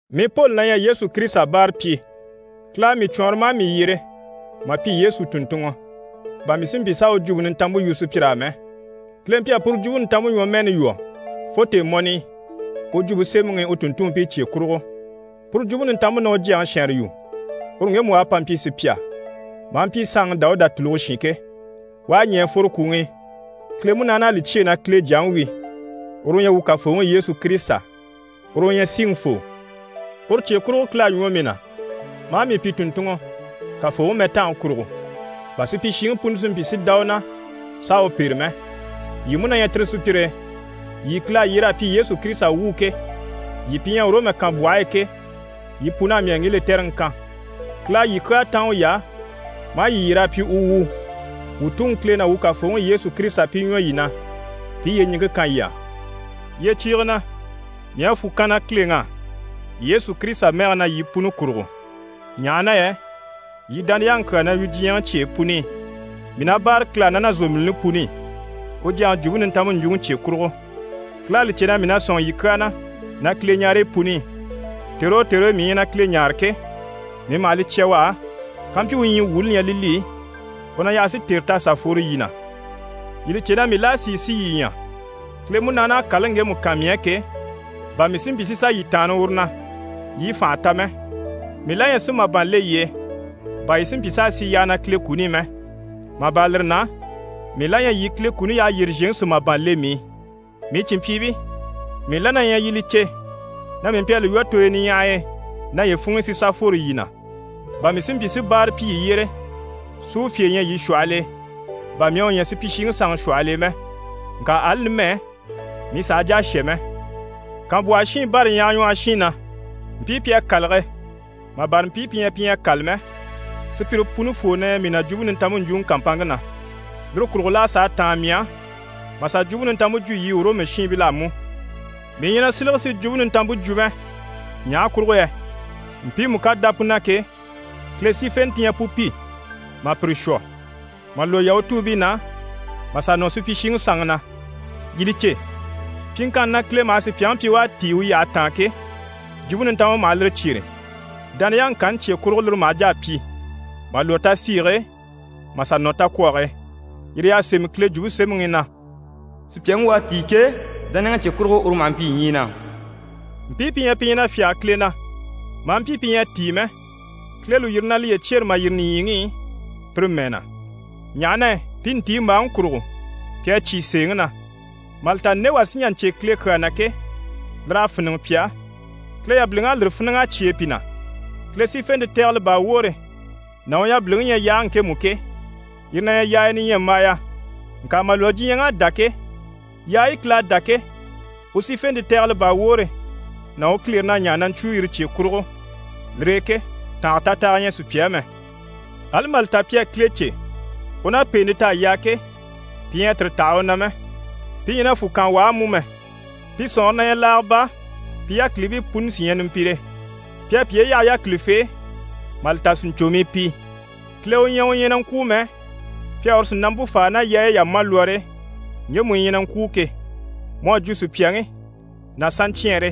Mii Poli na ɲyɛ Yesu Kirisita báarapyi. Kile à mii cwɔɔnrɔ maa mii yyere mà pyi Yesu tùnntunŋɔ, bà mii si mpyi s'a u Jwumpe Nintanmpe yu sùpyir'á mɛ. Kile mpyi a puru Jwumpe Nintanmpe ɲwɔmɛɛni lwɔ́ fo tèemɔni i u Jwumpe Semɛŋi i u tùnntunmpii cye kurugo. Puru Jwumpe Nintanmpe na u Jyaŋi shɛnrɛ yu, uru ŋgemu u à pa mpyi sùpya maa mpyi saanŋi Dawuda tùluge shin ke. U à ɲɛ̀ a fworo kwùŋi i, Kile Munaani à li cyêe na Kile Jyaŋi wi, uru u ɲyɛ wuu Kafooŋi Yesu Kirisita, uru u ɲyɛ síŋifoo. Uru cye kurugo Kile à ɲwɔ mii na, maa mii pyi tùnntunŋɔ Kafooŋi mɛtange kurugo, bà supyishiŋi puni si mpyi si dá u na s'a u pêre mɛ. Yii mú na ɲyɛ tire sùpyire e, yii Kile à yyere yii pyi Yesu Kirisita wuu ke. Yii pi ɲyɛ Ɔrɔmu kànbwɔhe e ke, yii pun'á mii à ŋge lɛtɛrɛŋi kan. Kile à yii kyaa táan uy'á, maa yii yyer'a pyi u wuu. Wuu Tuŋi Kile ná wuu Kafooŋi Yesu Kirisita pi ɲwɔ yii na, pi i yyeɲiŋke kan yii á. Yyecyiige na, mii à fwù kan na Kileŋi á, Yesu Kirisita mɛge na yii puni kurugo, ɲaha na yɛ yii dániyaŋi kyaa na yu diɲyɛŋi cyeyi puni i. Mii na báare Kile á ná na zòmbilini puni i, u Jyaŋi Jwumpe Nintanmpe ɲjwuŋi cye kurugo. Kile à li cè na mii na sɔ̂nŋi yii kyaa na, na Kileɲareyi puni i. Tère o tère e mii ɲyɛ na Kile ɲáare ke, mii maha li cya u á, kampyi u ɲyii wuuni li ɲyɛ li li, u na yaha si tère ta sà fworo yii na. Yii li cè na mii la à sìi si yii ɲya, Kile Munaani à kàlaŋi ŋgemu kan mii á ke, bà mii si mpyi si sà yii taanna uru na, yii i fànha ta mɛ. Mii la ɲyɛ si màban le yii e bà yii si mpyi s'a sì yyaha na Kile kuni i mɛ. Mà bâra lire na, mii la ɲyɛ yii Kile kuni yyaha yyére zhèŋi si màban le mii i. Mii cìnmpyiibii, mii la na ɲyɛ yii li cè, na mii mpyi a li lwɔ́ tooyo niɲyahay'e naye funŋ'i, si sà fworo yii na, bà mii si mpyi si báara pyi yii yyére si u fyè ɲya yii shwɔhɔl'e, bà mii à u ɲya supyishiŋi sanŋi shwɔhɔl'e mɛ. Ŋka ali numɛ, mii sàha jà a shà mɛ. Kànbwɔhɔshiin bâra ɲyɛgɛɲwɔhɔshiin na, mpii pi à kâla ke, mà bâra mpii pi ɲyɛ pi ɲyɛ a kâla mɛ, sùpyire puni fwoo na ɲyɛ mii na Jwumpe Nintanmpe ɲjwuŋi kàmpanŋke na. Lire kurugo l'à sàa táan mii á, mà sà Jwumpe Nintanmpe jwo yii Ɔrɔmu shiinbil'á mú. Mii ɲyɛ na sílege si Jwumpe Nintanmpe jwo mɛ, ɲaha kurugo yɛ mpiimu ká dá pu na ke, Kile sífenɛ ti ɲyɛ pu pi mà pire shwɔ, mà lwɔ́ Yahutuubii na, mà sà nɔ supyishiŋi sanŋi na. Yii li cè, pyiŋkanni na Kile maha sùpyaŋi pyi u à tíi u yyaha taan ke, Jwumpe Nintanmpe maha lire cyêre. Dániyaŋi kanni cye kurugo lire maha jà a pyi, mà lwɔ́ tasiige e, mà sà nɔ takwɔge e. Yire y'à sémɛ Kile Jwumpe Semɛŋi i na: «Sùpyaŋi u à tíi ke, dániyaŋi cye kurugo uru maha mpyi ɲyii na.» Mpii pi ɲyɛ pi ɲyɛ na fyáge Kile na, maa mpyi pi ɲyɛ a tíi mɛ, Kile lùyirini na liye cyêre mà yîri nìɲyiŋi i pire mɛɛ na, ɲaha na yɛ pi ntiimbaaŋi kurugo, pi à cyé sèeŋi na. Mà li ta, nde wà sí n‑jà n‑cè Kile kyaa na ke, lir'à fíniŋɛ pi á. Kile yabiliŋ'à lire fíniŋ'a cyêe pi na. Kile sífente tɛgɛlɛ baa woore ná u yabiliŋi ɲyɛ yaage ŋkemu ke, yire na ɲyɛ yaaya niɲyambaaya. Ŋka mà lwɔ́ diɲyɛŋ'à dá ke, yaayi Kile à dá ke, u sífente tɛgɛlɛ baa woore ná u kileere na ɲaa na ɲcwúu yire cye kurugo. Lire e ke tànga tataga ɲyɛ sùpya á mɛ. Ali mà li ta pi à Kile cè, u ná pèente t'à yaa ke, pi ɲyɛ a tire taha u na mɛ, pi ɲyɛ na fwù kaan u á mú mɛ. Pi sɔ̀nŋɔre na ɲyɛ laaga baa, pi yákilibii puni sí ɲyɛ numpire. Pi à piye yaha yákilifee, mà li ta sìɲcomii pi. Kile u ɲyɛ u ɲyɛ na ŋkwûu mɛ, pi à uru sìnampe fáa ná yaayi yà malwɔɔre e, ɲjemu yi ɲyɛ na ŋkwûu ke, mu à jwo: sùpyaŋi ná saɲcɛɛnre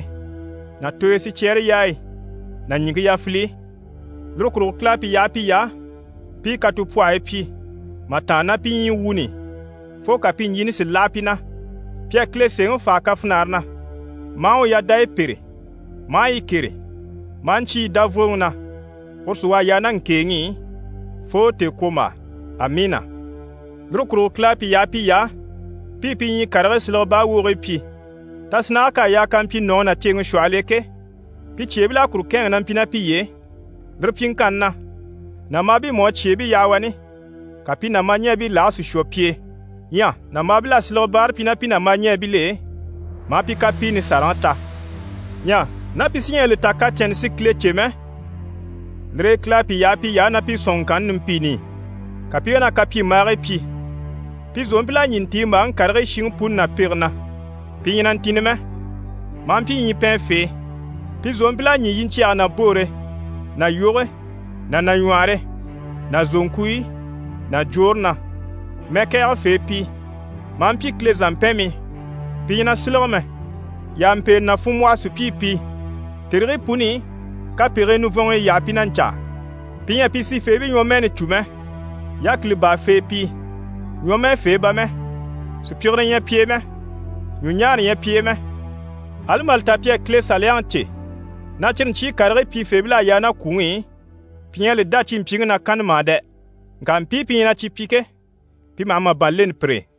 ná tooyo sicyɛɛre yaayi ná ɲìŋke yafiliyi. Lire kurugo Kile à pi yaha piy'á pi i katupwɔhɔyi pyi mà tàanna ná pi ɲyii wuuni i, fo ka pi ɲjini si láha pi na. Pi à Kile sèeŋi fáa kafinare na, maa u yadayi pêre maa yi kêre, maa ɲcyé yi Davooŋi na, uru sí u à yaa ná ŋkèeŋi i fo tèekwombaa. Amiina. Lire kurugo Kile à pi yaha piy'á pi i pi ɲyii karigii silege baa wogigii pyi. Tasinnage k'à yaa k'a mpyi nɔ̀ŋi ná ceeŋi shwɔhɔl'e ke, pi cyeebil'à kuru kɛ̂ɛnŋɛ na mpyi ná piye e. Lire pyiŋkanni na, nàmbaabii mú à cyeebii yaha wani, ka pi nàmbaɲɛɛbii lage si shwɔ pi e. Ɲyɛ nàmbaabil'à silegebaare pyi ná pi nàmbaɲɛɛbil'e, maa pi kapiini sàraŋi ta. Ɲyɛ ná pi sí ɲyɛ a li ta kacɛnnɛ si Kile cè mɛ, lire e Kile à pi yaha piy'á ná pi sɔ̀nŋɔŋkanni nimpiini i, ka pi i wá na kapyimbaagii pyi. Pi zòompil'à ɲî ntiimbaaŋi karigii shiŋi puni ná pege na, pi ɲyɛ na ntìnni mɛ, maa mpyi ɲyipɛɛnfee. Pi zòompil'à ɲî yiɲcyɛge ná boore ná yoge ná nàɲwɔhɔre ná zòŋkuuyi ná jwoore na. Mɛkɛɛgɛfee pi, maa mpyi Kile zàmpɛnmii. Pi ɲyɛ na silege mɛ, yàmpeenɛ ná funmbwɔhɔ sùpyii pi. Tèrigii puni i, kapegii nivɔnŋii yyaha pi na ɲcaa. Pi ɲyɛ a pi sifeebii ɲwɔmɛɛni cû mɛ. Yákili baafee pi, ɲwɔmɛɛfee bà mɛ, sùpyigire ɲyɛ pi e mɛ, ɲùɲaara ɲyɛ pi e mɛ. Ali mà li ta pi à Kile Saliyaŋi cè, na cyire ɲcyii karigii pyifeebil'à yaa ná kwùŋi i, pi ɲyɛ a li dâ cyi mpyiŋi kanni na mà dɛ! Ŋka mpii pi ɲyɛ na cyi pyi ke, pi maha màban leni pire e.